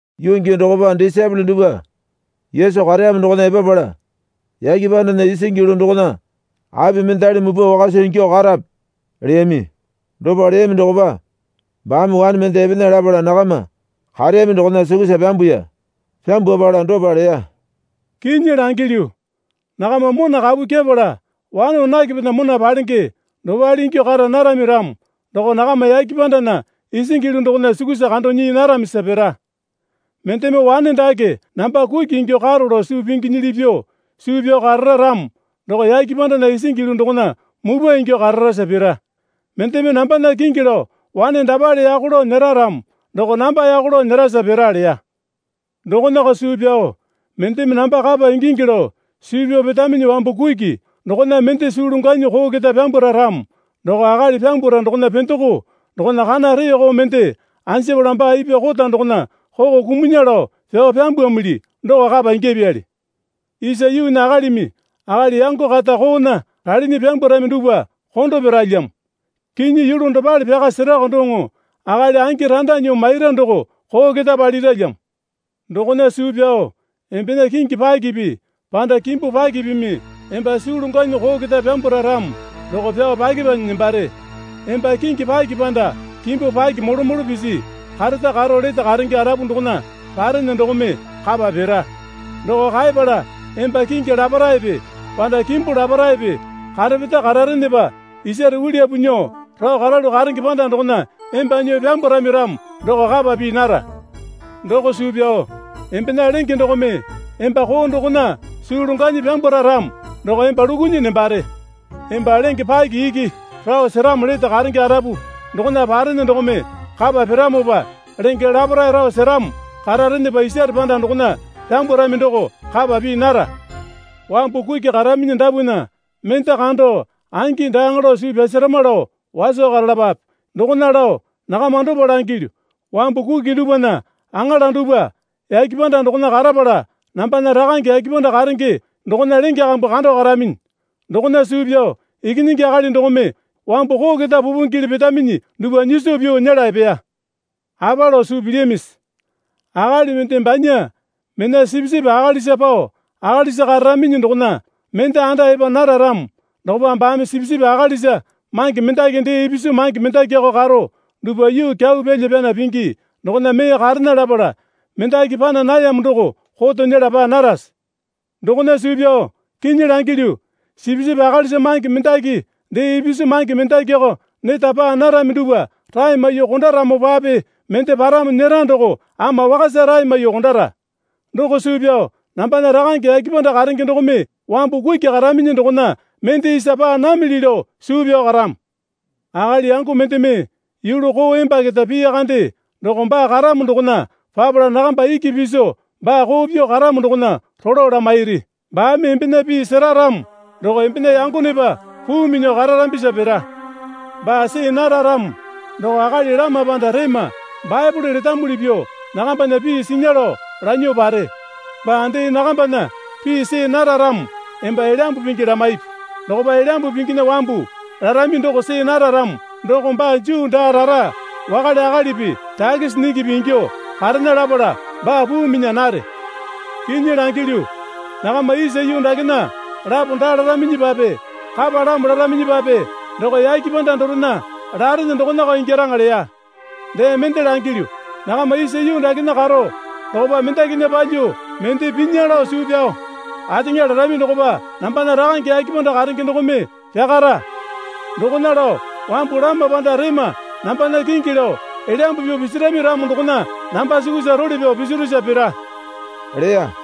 Yuu gii dokopa disaepole dupwa Yesu kareyamo dokona epapala, Yake pandana isingi yulu dokona api mendali mupwa wakasa ingyuo karape? leyami. Dopa leyami dokopa baame wane mende epena lapala nakama kareyami dokona sukusa pyambuya. Pyambwapala dopa leya. Kinyi langilyu, nakama mona kapu kyepala wane wanakepena mona palenge dopale ingyuo kara narami ramo doko nakama yake pandana isingi yulu dokona sukusa kando nyii naramisa pira. Mendeme wane dake namba kuki ingyuo karo lao suu pinginyili pyuo suu pyao karara ramo doko yake pandana isingi yulu dokona mupwa ingyuo kararasa pira. Mendeme nambana kingi lao wane dapale yako lao nyera ramo doko namba yako lao nyerasa pira leya. Dokonako suu pyao mendeme namba kapa ingingi lao suu pyao petaminyi wambu kuki dokona mende suu longwanyi koo keta pyambwara ramo doko akali pyambwara dokona pendoko dokona kana reeko mende anjapala baa ipwa kota dokona koko kumunya lao pyao pyambwamili doko kapa ingyapyali. Isa yuunya akalimi akali yango kata koona ralinyi pyambwarami dupwa kondo piralyamo. Kinyi yulu dopale pyaka serako doŋo, akali angi randa nyuo maira doko koo keta paliralyamo. Dokona suu pyao embena kingi pakipi panda kimbu pakipimi emba suu longwanyi koo keta pyambwara ramo doko pyao pyakepanyi nembare. Emba kingi paki panda kimbu pakipi molo molo pisi kareta karo lete karenge arapu dokona parene dokome kapa pira. Doko kaepala emba kingi laparaepe panda kimbu laparaepe karepeta kararenepa isare uliyapu nyuo rao karalu karenge panda dokona emba nyuo pyambwarami ramo doko kapa pii nara. Doko suu pyao embena lenge dokome emba koo dokona suu longwanyi pyambwara ramo doko emba lukunyi nembare. Emba lenge paki iki rao seramo lete karenge arapu dokona parene dokome kapa piramopa lenge laparae rao seramo kararenepa isare panda dokona pyambwarami doko kapa pii nara. Wambu kuki karaminyi dapwana mende kando angi daaŋa lao suu pyasarama lao waso karalapape. Dokona lao nakama dopa langilyu. Wambu kuki dupwana aŋala dupwa yake panda dokona karapala nambana Rakange yake panda karenge dokona lenge kambu kando karaminyi. Dokona suu pyao Ikinyingi Akali dokome wambu koo keta pupingele petaminyi dupwa nyiso pyuo nyela epeya. Apa lao suu pilyamisi? Akali mende banya mena sipisipi akalisa pao akalisa kararaminyi dokona mende anda epa nara ramo dokopa baame sipisipi akalisa mange mendaki dee ipisu mange mendakiko karo dupwa yuu kyau pyalya pyana pingi dokona mee karena lapala mendaki pana nayamo doko koto nyela paa narase? Dokona suu pyao kinyi langilyu, sipisipi akalisa mange mendaki dee ipisu mange mendakiko neta paa narami dupwa rae maiyuo kondaramopape mende paramo nyera doko ama wakasa rae maiyuo kondara. Doko suu pyao nambana Rakange yake panda karenge dokome wambu kuki karaminyi dokona mende isa paa namili lao suu pyao karamo. Akali yango mendeme yulu koo emba keta piya kande doko baa karamo dokona papala nakamba iki piso baa koo pyuo karamo dokona rolo lamairi. Baame embena pii sera ramo doko embena yangonepa puu minyuo kararambisa pira. Paa see nara ramo doko akali lama panda rema Baepole letamuli pyuo nakambana pii sinya lao lanyuo pare. Baa dee nakambana pii see nara ramo emba Elyambu Pingi lamaipi. Dokopa Elyambu Pinginya wambu larami doko see nara ramo doko baa Juu daa rara wakale akalipi takisi nyingipi ingyuo karena lapala baa puu minya nare. Kinyi langilyu, nakama isa yuu dakena lapo daa laraminyipape kapalamo laraminyipape doko yake panda dorena larene dokonako ingyaraŋa leya. Dee mende langilyu. Nakama isa yuu dakena karo dokopa mendakinya palyuo mende pinya lao suu pyao ateŋa larami dokopa nambana Rakange yake panda karenge dokome pyakara. Dokona lao wambu lama panda rema nambana kingi lao elyambu pyuo pisirami ramo dokona namba sukusa role pyao pisirusa pira, leya.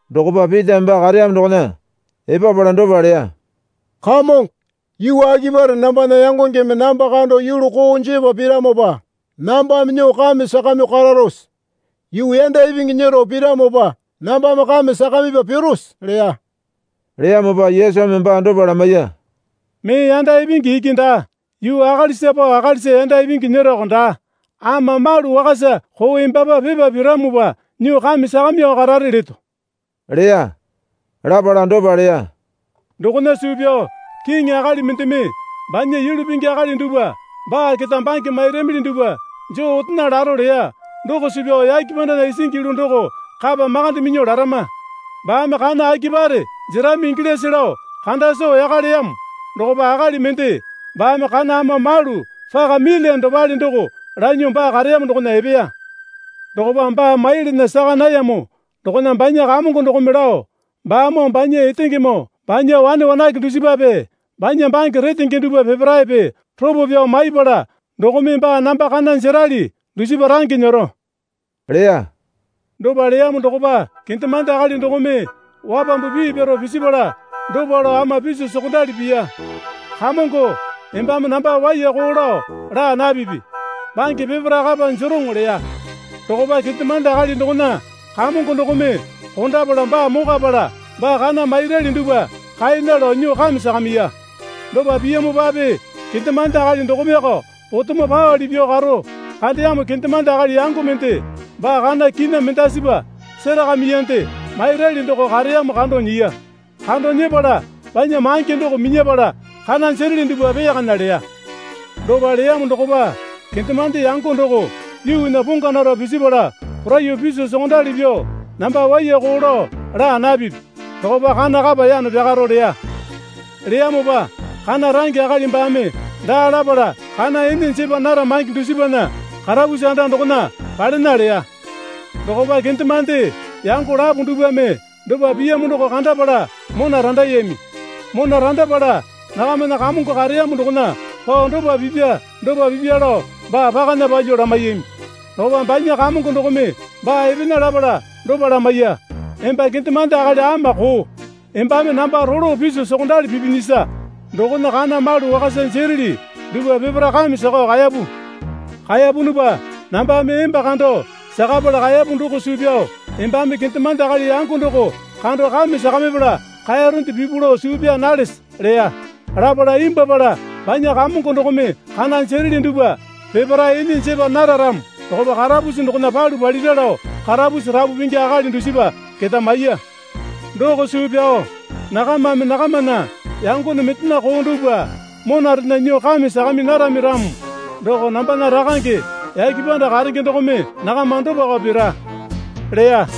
Dokopa Pitame baa kareyamo dokona epapala dopa leya. Kamongo, yuu akipare nambana yangongeme namba kando yulu koo jepa piramopa nambame nyuo kame sakamyuo kararose? Yuu yanda ipingi nyero piramopa nambame kame sakamipa pirose? leya. Leyamopa Yesumi baa dopa lamaiya. Mee yanda ipingi iki daa, yuu akalisa pao akalisa yanda ipingi nyeroko daa, ama malu wakasa koo embapa pipa piramopa nyuo kame sakamyuo karare leto, leya. Lapala dopa leya. Dokona suu pyao kiŋi akali mendeme banya yulu pingi akali dupwa baa keta bange mairamili dupwa joo otena laro leya doko suu pyao yake pandana isingi yulu doko kapa makande minyuo larama. Baame kana akipare jerami ingilyase lao kanda soo yaka leyamo dokopa akali mende baame kana ama malu paka milyane dopale doko lanyuo baa kareyamo dokona epeya. Dokopa baa maiyalana saka nayamo dokona banya kamongo dokome lao, Baamoo banya etengemoo banya wane wanake dusipape banya bange retenge dupwa peparaepe ropo pyao maipala dokome baa namba kana jerali dusipa range nyero, leya. Dopa leyamo dokopa kendemande akali dokome wapambu pii pyaro pisipala dopa lao ama piso sokondali piya. Kamongo embame namba waiyako lao laa napipi. Bange peparae kapa jeroŋo leya. Dokopa kendemande akali dokona kamongo dokome kondapala baa mokwapala baa kana mairali dupwa kaena lao nyuo kame sakamiya. Dopa piyamopape kendemande akali dokomeko potemo paowale pyuo karo kandeyamo kendemande akali yango mende baa kana kina mendasipa serakamiyande mairali doko kareyamo kando nyiya. Kando nyepala banya mange doko minyapala, kana jereli dupwa peyakana leya. Dopa leyamo dokopa kendemande yango doko yuunya pongwa naro pisipala poraiyuo piso sokondali pyuo, Namba waiyako lao laa napipi. Dokopa kana kapa yano pyakaro, leya. Leyamopa kana range akali baame daa lapala kana ene jepa nara mange dusipana karapusi anda dokona palena leya. Dokopa kendemande yango lapo dupwame dopa piyamo doko kandapala mona randayami. Mona randapala nakamana kamongo kareyamo dokona pao dopa pipya dopa pipya lao baa pakana palyuo lamaiyami. Dokopa banya kamongo dokome baa epena lapala dopa lamaiya. Emba kendemande akali ama koo. Embame namba rolo piso sokondali pipinyisa dokona kana malu wakasa jereli dupwa peparae kame sakao kaeyapu. Kaeyapunupa nambame emba kando sakapala kaeyapu doko suu pyao embame kendemande akali yango doko kando kame sakamipala kaeyaronde pipu lao suu pyaa nalese? leya. Lapala imbwuapala banya kamongo dokome kana jereli dupwa peparae ene jepa naro ramo dokopa karapusi dokona palu palira lao karapusi rapu pingi akali dusipa keta maiya. Doko suu pyao nakamame nakamana yangone mendena koo dupwa monarena nyuo kame sakami narami ramo doko nambana Rakange yake panda karenge dokome nakama dopako pira, leya.